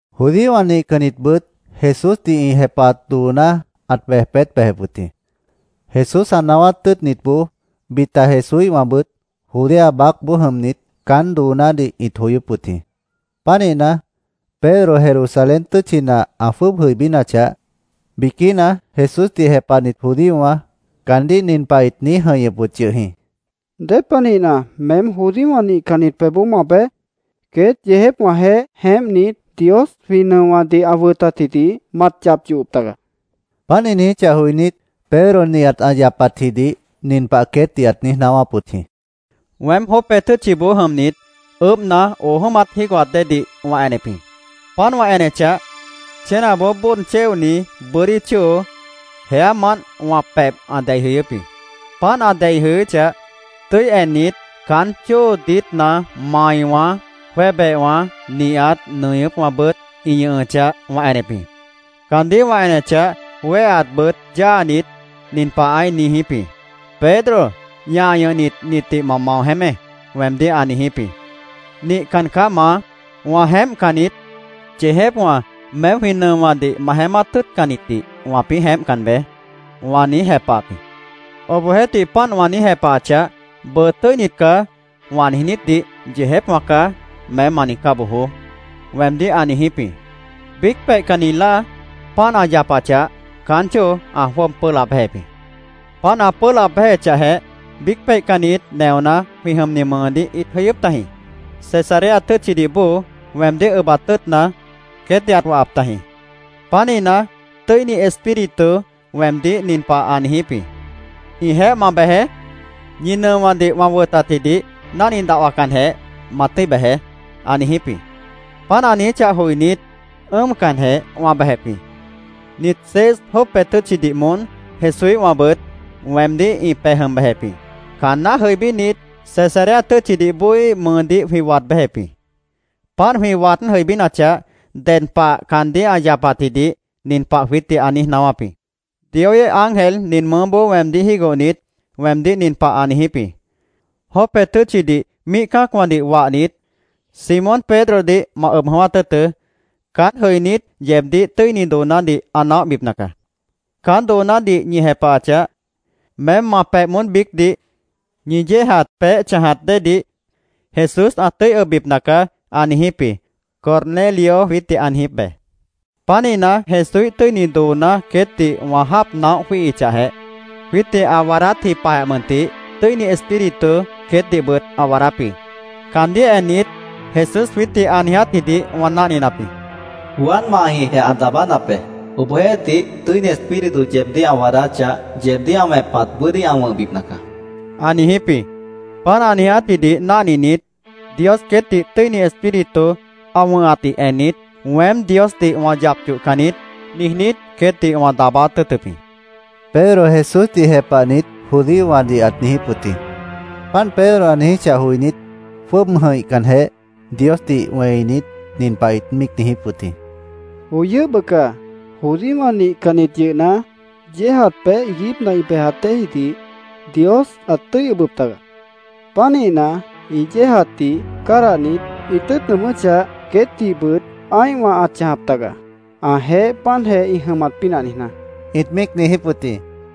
Judíowã nihcannitbʉt Jesúsdih ĩ jepahat dooná ãt bej peét bejep wʉt jĩ. Jesús ã naáwát tʉ́ʉtnitboó, bita Jesúíhwãbʉt Judea baácboó jʉmnit, caán doonádih ĩt joyóp wʉt jĩ. Pánihna, Pedro Jerusalén tʉ́tchina ã jwʉ́ʉb jʉibínachah, biquína Jesúsdih jepahnit judíowã, caandíh nin pah ĩt niíj jʉ̃ihñʉp wʉt yʉh jĩ: —¿Dépanihna, meém judíowã nihcannit pebhboó ma bej? Queét yeejépwãjeéh jeémpnit, Dios jwĩ nʉowãdih ã wʉtatjidih mat yap yohop taga, ĩt niijíp wʉt jĩ. Páant, ĩ niijíchah joinít, Pedro nihat ã yapatjidih nin pah queétdih ãt niíj naáwáp wʉt jĩ: —Weém Jope tʉ́tchiboó jʉmnit, ʉʉ́bhna, oo jʉ́mat jígohat déedih wã enep jĩ. Páant wã enechah, chénaboó bóod chéoni bʉ́dí chóo jeámant wã pebh ã dei jʉyʉ́p jĩ. Páant ã dei jʉyʉ́chah, tʉ́i ennit, caán chóo diítna maiwã, jwébehwã nihat nʉñʉ́pwãbʉt ĩ ñʉhʉchah, wã enep jĩ. Caandíh wã enechah, wéheatbʉt yáanit, nin pah ãí niijíp jĩ: ‘Pedro, ñah ñʉhnit, nitdih ma mao jeémé’, weemdíh ã niijíp jĩ. ‘Nihcan caá, Maá. Wã jeémpcan niít. Yeejépwã, meém jwĩ nʉowãdih ma jeémát tʉ́ʉtcannitdih wãpĩ́ jeémpcan beé’, wã niíj jepahap jĩ. Obohjeéhtih, páant wã niíj jepahachah, ‘Bʉʉ “Tʉ́init caá”, wã niijnítdih “Yeejépwã caá”, meém ma niijcá bojoó’, weemdíh ã niijíp jĩ. Biíc peihcanni láa páant ã yapachah, caán chóo ã jwʉ́ʉb pʉ́ʉh laab béjep jĩ. Páant ã pʉ́ʉh laab béjechahjeh, biíc peihcannit neoná jwĩ jʉmni mʉʉdíh ĩt jʉyʉ́p tajĩ. Cesarea tʉ́tchidih bóo weemdíh ʉbat tʉ́ʉtna, queétdih ãt wahap tajĩ. Pánihna, Tʉ́ini Espíritu weemdíh nin pah ã niijíp jĩ: ‘Ĩjeéh ma bejeé. Ñi nʉowãdih wã wʉtatjidih náhni dahwacanjeh ma tʉ́i bejeé’, ã niijíp jĩ. Páant ã niijíchah joinít, ʉ́ʉmcanjeh wã bejep jĩ. Nit seis Jope tʉ́tchidih moón Jesúíhwãbʉt weemdíh ĩ pej jʉm bejep jĩ. Caanná jʉibínit, Cesarea tʉ́tchidih bóoíh mʉʉdíh jwĩ waad béjep jĩ. Páant jwĩ waád jʉibínachah, ded pah caandíh ã yapatjidih nin pah jwiítdih ã niíj naáwáp jĩ: ‘Dioíh ángel nin mʉʉ́boó weemdíh jígohnit, weemdíh nin pah ã niijíp jĩ: “Jope tʉ́tchidih míih cã́acwãdih wahnit, Simón Pedrodih ma ʉb jʉ̃ʉ́wát tʉ́ʉtʉ́. Caán jʉinít, yeebdíh tʉ́ini doonádih ã naóhbipna caá. Caán doonádih ñi jepahachah, meém ma pebh moón biícdih ñi yéejat peéh chãjat déedih Jesús ã tʉ́i ʉbbipna caá”, ã niijíp jĩ’, Cornelio jwiítdih ã niijíp be. Pánihna, Jesúíh tʉ́ini dooná queétdih wã jáap naóh jwíihichahjeh, jwiítdih ã waadátji pah mʉntih, Tʉ́ini Espíritu queétdihbʉt ã waadáp jĩ. Caandíh ennit, Jesús jwiítdih ã niijátjidih wã náhninap jĩ: ‘Juan mahjĩhjeh ã daabánap be. Obohjeéhtih, Tʉ́ini Espíritu yeebdíh ã waadáchah, yeebdíh ã wẽpat bʉ́dí ã wʉ̃hbipna caá’, ã niijíp jĩ. Páant ã niijátjidih náhninit, Dios queétdih Tʉ́ini Espíritu ã wʉ̃hatdih ennit, ‘Weém Diosdih wã yap yohcan niít’, niijnít, queétdih wã daabáát tʉ́ʉtʉp jĩ, Pedro Jesúsdih jepahnit judíowãdih ãt niijíp wʉt jĩ. Páant Pedro ã niijíchah joinít, jwʉ́ʉb jʉ̃ihcanjeh, Diosdih wẽinit, nin pah ĩt míic niijíp wʉt jĩ. —¡Joi yʉ́h bʉca! Judíowã nihcannit yʉhna, yéejat peéh iiguípna ĩ bejat déejidih Dios ãt tʉ́i ʉbʉp taga. Pánihna, ĩ yéejatdih cádahnit, ĩ tʉ́ʉt nʉʉmʉ́chah, queétdihbʉt ã́ihwã ãt chãjap taga, ãjeéh páantjeh ĩ jʉmat pínah niijná, ĩt míic niijíp wʉt jĩ.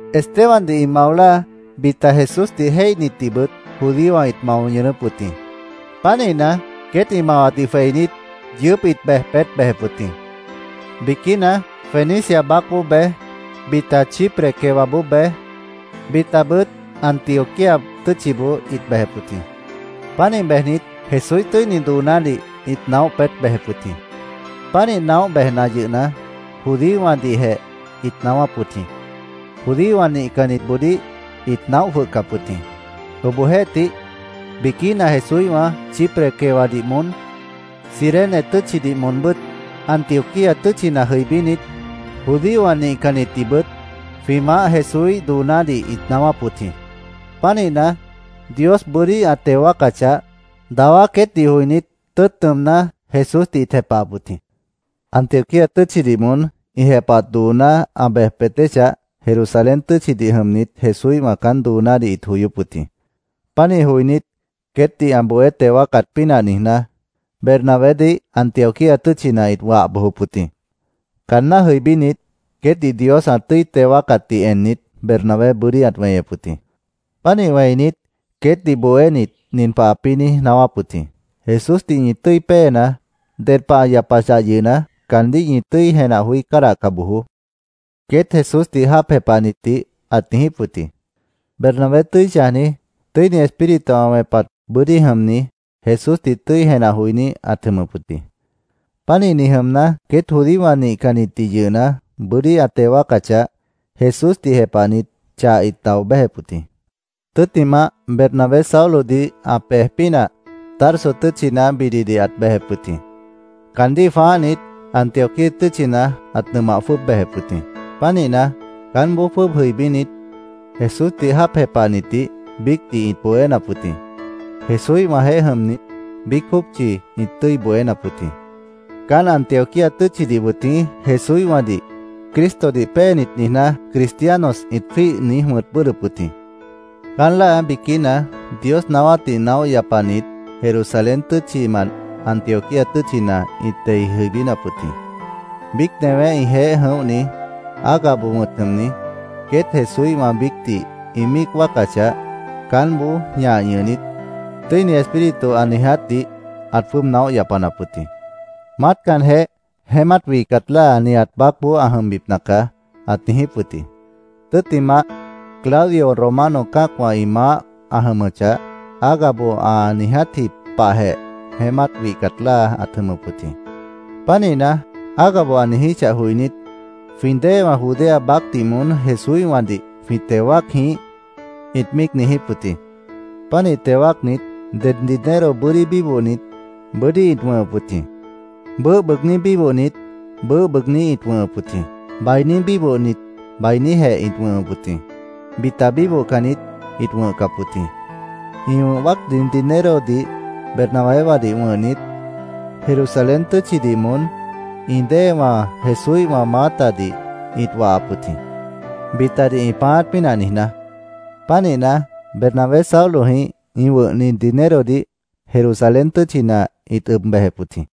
Estebandih ĩ mao láa, bita Jesúsdih jéihnitdihbʉt judíowã ĩt mao ñʉʉnʉ́p wʉt jĩ. Pánihna, queét ĩ mawatdih jweinít, yʉʉ́p ĩt bej peét bejep wʉt jĩ. Biquína Fenicia baácboó bej, bita Chipre quewaboó bej, bitabʉt Antioquía tʉ́tchiboó ĩt bejep wʉt jĩ. Pánih bejnit, Jesúíh tʉ́ini doonádih ĩt naóh peét bejep wʉt jĩ. Pánih naóh bejna yʉhna, judíowãdihjeh ĩt naáwáp wʉt jĩ. Judíowã nihcannitboodíh ĩt naóh jwʉhcap wʉt jĩ. Obohjeéhtih, biquína Jesúíhwã Chipre quewadih moón, Cirene tʉ́tchidih moonbʉ́t, Antioquía tʉ́tchina jʉibínit, judíowã nihcannitdihbʉt jwĩ Maáh Jesúíh doonádih ĩt naáwáp wʉt jĩ. Pánihna, Dios bʉ́dí ã teo wáacachah, dawá queétdih joinít, tʉ́ʉt nʉʉmná, Jesúsdih ĩt jepahap wʉt jĩ. Antioquía tʉ́tchidih moón ĩ jepahat dooná ã bej peét bejechah, Jerusalén tʉ́tchidih jʉmnit Jesúíhwã caán doonádih ĩt joyóp wʉt jĩ. Pánih joinít, queétdih ã bohé teo wáacat pínah niijná, Bernabédih Antioquía tʉ́tchina ĩt wah bojop wʉt jĩ. Caanná jʉibínit, queétdih Dios ã tʉ́i teo wáacatdih ennit, Bernabé bʉ́dí ãt weñep wʉt jĩ. Pánih wẽinit, queétdih bohénit, nin pah ãpĩ́ niíj naáwáp wʉt jĩ: “Jesúsdih ñi tʉ́i péenaá. Ded pah ã yapachah yʉhna, caandíh ñi tʉ́i jenah joí cádahca bojoó”, queét Jesúsdih jáap jepahnitdih ãt niijíp wʉt jĩ. Bernabé tʉ́i chãjni, Tʉ́ini Espíritu ã wẽpat bʉ́dí jʉmni, Jesúsdih tʉ́i jenah joiní ãt jʉmʉp wʉt jĩ. Pánihni jʉmna, queét judíowã nihcannitdih yʉhna, bʉ́dí ã teo wáacachah, Jesúsdih jepahnit chah ĩt dao béjep wʉt jĩ. Tʉ́ttimah, Bernabé Saulodih ã pej pínah Tarso tʉ́tchina bididih ãt bejep wʉt jĩ. Caandíh jwãáhnit, Antioquía tʉ́tchina ãt nʉmah jwʉ́ʉb bejep wʉt jĩ. Pánihna, caánboó jwʉ́ʉb jʉibínit, Jesúsdih jáap jepahnitdih biícdih ĩt bohénap wʉt jĩ. Jesúíhwãjeéh jʉmnit, biíc jópchi ĩt tʉ́i bohénap wʉt jĩ. Caán Antioquía tʉ́tchidih wʉt jĩ Jesúíhwãdih “Cristodih péenit”, niijná, “Cristianos”, ĩt jwíih niíj wʉ̃t bʉ́ʉdhdʉp wʉt jĩ. Caán láa biquína Dios naáwátdih naóh yapanit Jerusalén tʉ́tchimant Antioquía tʉ́tchina ĩt dei jʉibínap wʉt jĩ. Biíc newé ĩjeéh jʉ̃óhni, Agabo wʉ̃t jʉmni, queét Jesúíhwã biícdih ĩ míic wáacachah, caánboó ñah ñʉhnit, Tʉ́ini Espíritu ã niijátdih ãt jwʉ́ʉb naóh yapanap wʉt jĩ. “Maátcanjeh, jeémát wihcat láa nihat baácboó ã jʉmbipna caá”, ãt niijíp wʉt jĩ. Tʉ́ttimah, Claudio Romano cã́acwã ĩ maáh ã jʉmʉchah, Agabo ã niijátji pahjeh jeémát wihcat láa ãt jʉmʉp wʉt jĩ. Pánihna, Agabo ã niijíchah joinít, “¿Jwĩ déewã Judea baácdih moón Jesúíhwãdih jwĩ teo wáac jĩíh?” ĩt míic niijíp wʉt jĩ. Pánih teo wáacnit, det dinero bʉ́dí bíbohnit bʉ́dí ĩt wʉ̃hʉp wʉt jĩ. Bʉʉ́h bʉʉgní bíbohnit bʉʉ́h bʉʉgní ĩt wʉ̃hʉp wʉt jĩ. Bainí bíbohnit bainíjeh ĩt wʉ̃hʉp wʉt jĩ. Bita bíbohcannit ĩt wʉ̃hcap wʉt jĩ. Ĩ wʉ̃h wáacni dinerodih Bernabéwãdih wʉ̃hnit, Jerusalén tʉ́tchidih moón ĩ déewã Jesúíhwã maátadih ĩt wahap wʉt jĩ, bitadih ĩ pãáát pínah niijná. Pánihna, Bernabé Saulojĩh ĩ wʉ̃hni dinerodih Jerusalén tʉ́tchina ĩt ʉb bejep wʉt jĩ.